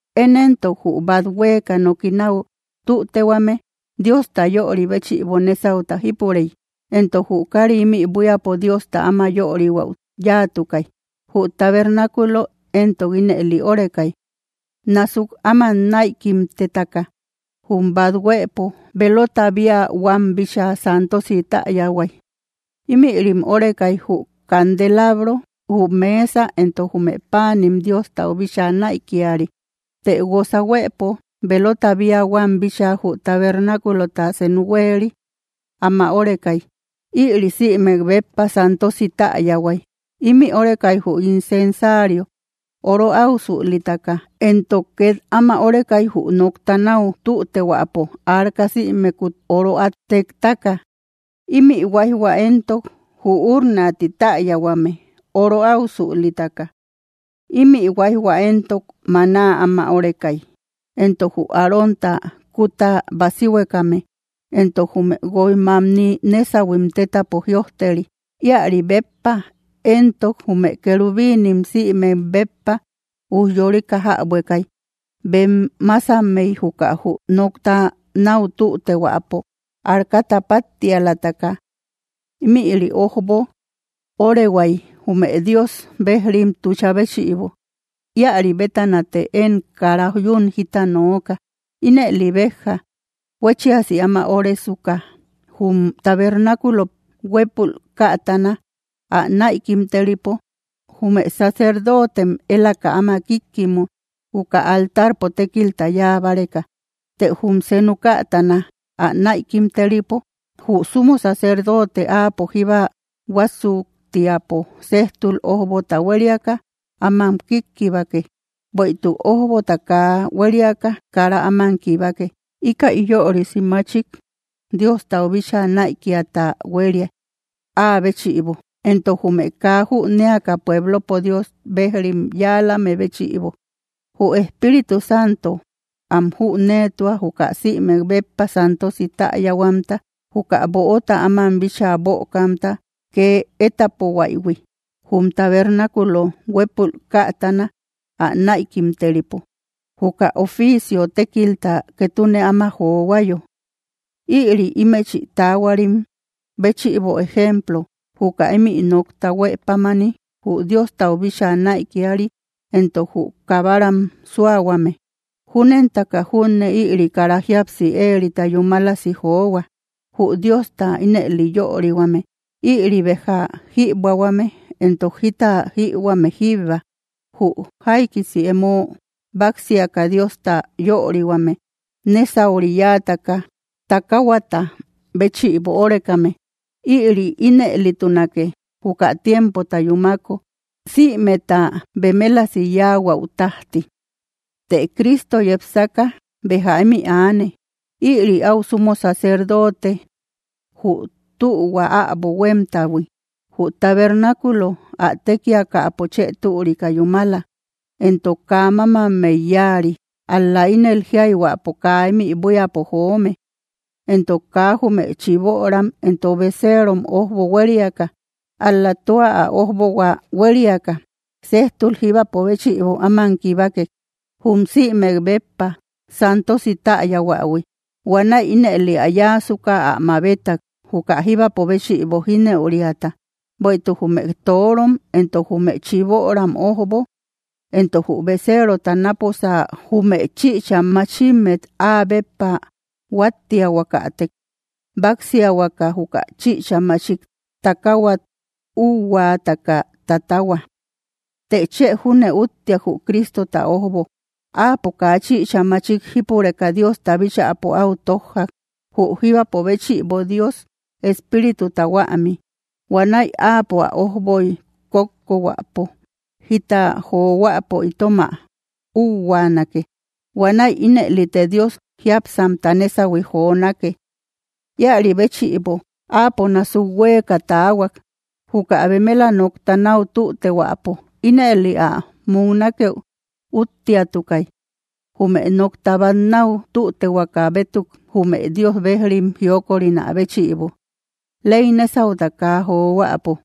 Én éntok, jü bát huéeka noki náu tütehuame, Diosta yöri béchïbo nésauta jípurey, entok jü kári ímï buíapo Diosta áma yörihuäu yáatukay. Jü tabernáculo éntok ínëli órekay: násuk áman näikimtetaka, jum bát huëpo, véelota bía huam bíchaa santosi täyahuay. Ímïrim órekay, jü candelabro, jü mesa entok jume páanim Diostau bíchaa näikiari. Të guosa huëpo velota bía huam bíchaa jü tabernáculota senu huéeri áma órekay. Ïri sïmek béppa santosi täyahuay. Ímï órekay jü incensario oro áusülitaka, entok két áma órekay jü nokta náu tütehuäpo arca, sïmekut oro át téktaka. Ímï huáijhua éntok jü urna ti täyahuame oro áusülitaka. Ímï huáijhua éntok maná áma órekay, éntok jü Arónta kuta basihuekame, entok jume guoj mamni nésahuim tétapo jïojteri. Íäri béppa éntok jume querubinim sïmek béppa ujyorika jäbuekay, bem másammey juka jü nokta náu tütehuäpo arcata páttialataka. Ímïri ojbo öorehuay jume Dios bejrim tucha béchïbo. Íäri bétanate én kara yún jita nooka. Ínëli béja huéchiasi áma óresuka, jum tabernáculo huépul kätana ä näikimteripo, jume sacerdotem élaka áma kíkkimu, juka altarpo tékilta yáa báreka. Të jum senu kätana ä näikimteripo, jü sumo sacerdote áapo jíbba huásuktiapo séjtul ójbota huériaka áman kíkkibake, bueïtuk ójbota kaa huériaka kara áman kibake. Íkäi yörisi machik Diostau bíchaa näikiata huéria, áa béchïbo, entok jume kaa jünéaka pueblopo Dios bejrim yáalame béchïbo. Jü Espíritu Santo am jüneetua, juka sïmek béppa santosi täyahuamta, juka böota áman bíchaa bökamta kee étapohuaïhui, jum tabernáculo huépul kätana ä näikimteripo, juka oficio tékilta ketune áma johuayo. Ïri ímëchi taahuarim béchïbo ejemplo, juka ímï nokta huë pámani jü Diostau bíchaa näikiari entok jü kabaram súahuame. Júnentaka junne ïri kara jíapsi éerita yúmalasi johua, jü Diosta ínëli yörihuame. Ïri béja jïbuähuame entok jita jïhuame jíbba, jü jaikisi emo báksiaka Diosta yörihuame, nésauri yáataka takaahuata béchïbo órekame. Ïri ínëlitunake, juka tiempota yúmako sïmeta bemelasi yáahuäu tájti. Të Cristo yepsaka béja ímï aane. Ïri áu sumo sacerdote jü tühua äbo huémtahui. Jü tabernáculo ä tékiakäpo chë türika yúmala, entok kaa mámammey yáari, ál‑la ínel jíayhuäpo kaa ímï buíapo joome. Entok kaa jume chiböram entok beserom ójbo huériaka, ál‑la tua ä ójbohua huériaka, séjtul jíbapo béchïbo áman kibakek, jum sïmek béppa santosi täyahuähui. Huanäi ínëli ä yáasuka ä mabetak, juka jíbapo béchïbo jínëuriata. Bueïtuk jume torom entok jume chiböram ójbo, entok jü beseerota náposa jume chïcha machimmet áa béppa huáttiahuakatek, báksiahuaka juka chïcha machik takaahuat úuhuataka tatahua. ¡Të chë júne úttiak, jü Cristota ójbo! Áapo kaa chïcha machik jípureka Diosta bíchäpo áu tójjak, jü jíbapo béchïbo Dios Espírituta huämi. Huanäi áapo ä ójboy kókkohuäpo jita johuäpo itom ä úuhuaanake. Huanäi ínëlite Dios jiápsamta nésahui jonake. Íäri béchïbo, Áapo násuk huéeka taahuak, juka bemela nokta náu tütehuäpo. Ínëli ä muknakeu úttiatukay, jume nokta bát náu tütehuaka bétuk jume Dios bejrim jiokorinä béchïbo, ley nésauta kaa johuäpo.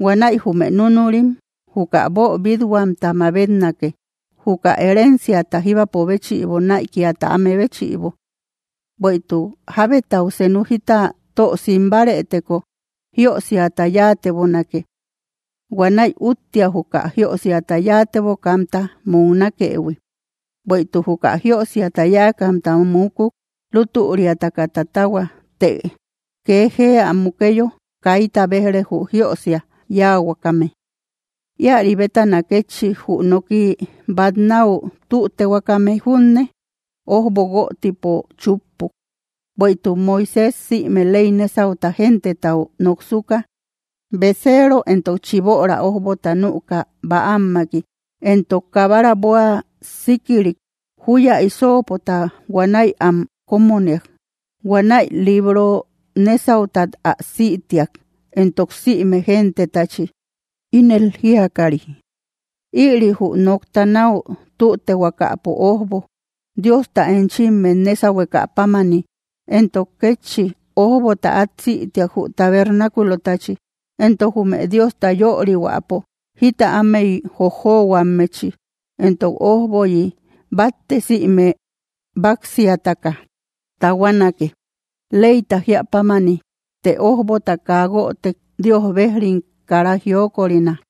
Huanäi jume núnurim juka boobit-huamta mabetnake, juka herenciata jíbapo béchïbo näikiata áme béchïbo. Bueïtuk jábetau senu jita tö sim bárëteko, jiösiata yáatebonake. Huanäi úttia, juka jiösiata yáatebokamta muknakëhui. Bueïtuk juka jiösiata yáakamta mukuk, lútüriataka tatahua; të kee jee ä mukeyo kaita béj‑re, jü jiösia yáahuakame. Íäri bétana kétchi, jü noki bát náu tütehuakame junne ójbo guötipo chúppuk. Bueïtuk Moisés sïme ley nésauta gentetau noksuka, beseero entok chiböra ójbota nüka bäammaki. Entok kabara bóa síkirik, júya hisoopota huanäi am kómoniak. Huanäi libro nésautat ä sïtiak, entok sïme gentetachi, ínel jíakari: “Ïri jü nokta náu tütehuakapo ójbo, Diosta enchimmet nésahueka pámani.” Entok kétchi, ójbota át sïtiak, jü tabernáculotachi, entok jume Diosta yörihuäpo jita ámey jojohuammechi. Entok ójboyi batte sïme báksiataka tahuanake, leyta jíä pámani; të ójbota kaa guötek, Dios bejrim kara jiokorina.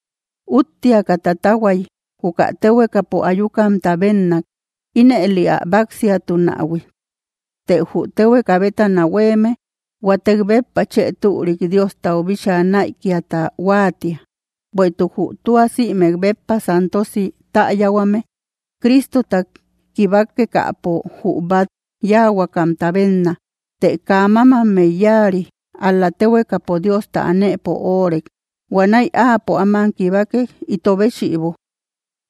Úttiataka tatahuay, juka téhuekapo ayukamta bénnak ínëli ä báksiatunähui; të jü téhueka bétana huéeme huatek béppa chë türik Diostau bíchaa näikiata huáatia. Bueïtuk jü tua sïmek béppa santosi täyahuame Cristota kibakekäpo jü bát yáahuakamta bénna, të kaa mámammey yáari, ál‑la téhuekapo Diosta anëpo óorek. Huanäi Áapo áman kibakek, ito béchïbo.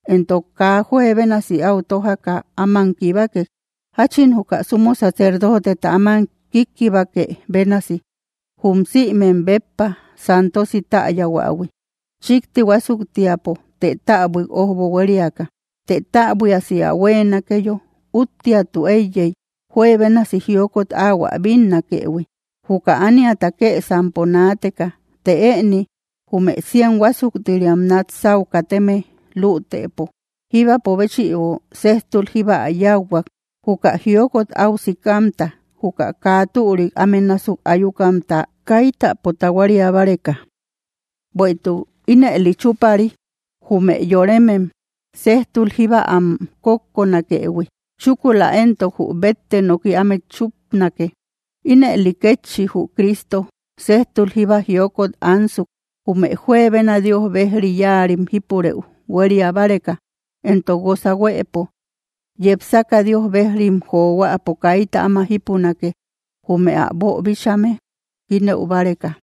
Entok kaa juebénasi áu tójaka áman kibakek, jáchin juka sumo sacerdoteta áman kíkkibake bénasi, jum sïmek béppa santosi täyahuähui, chíkti huásuktiapo, të täbuik ójbo huériaka. Të täbuiasi ä huéenakeyo, úttiatu éiyey juebénasi jiokot ahuä bínnakëhui, juka ániata kësampo naateka. Të ëni jume cien huásuktiriam nat sáu kateme lütëpo, jíbapo béchïbo séjtul jíba ä yáuhuak, juka jiokot áu sikamta, juka kaa türik áme násuk ayukamta kaitapo tahuaria báreka. Bueïtuk ínëli chúpari jume yoremem, séjtul jíba am kókkonakëhui; chúkula entok jü bette noki ámet chúpanake. Ínëli kétchi jü Cristo séjtul jíba jiokot ansuk, jume juebena Dios bejri yáarim jípurëu huéria báreka, entok guosa huëpo, yepsaka Dios bejrim johuäpo kaita áma jípunake, jume ä boobíchaïhuime jínëu báreka.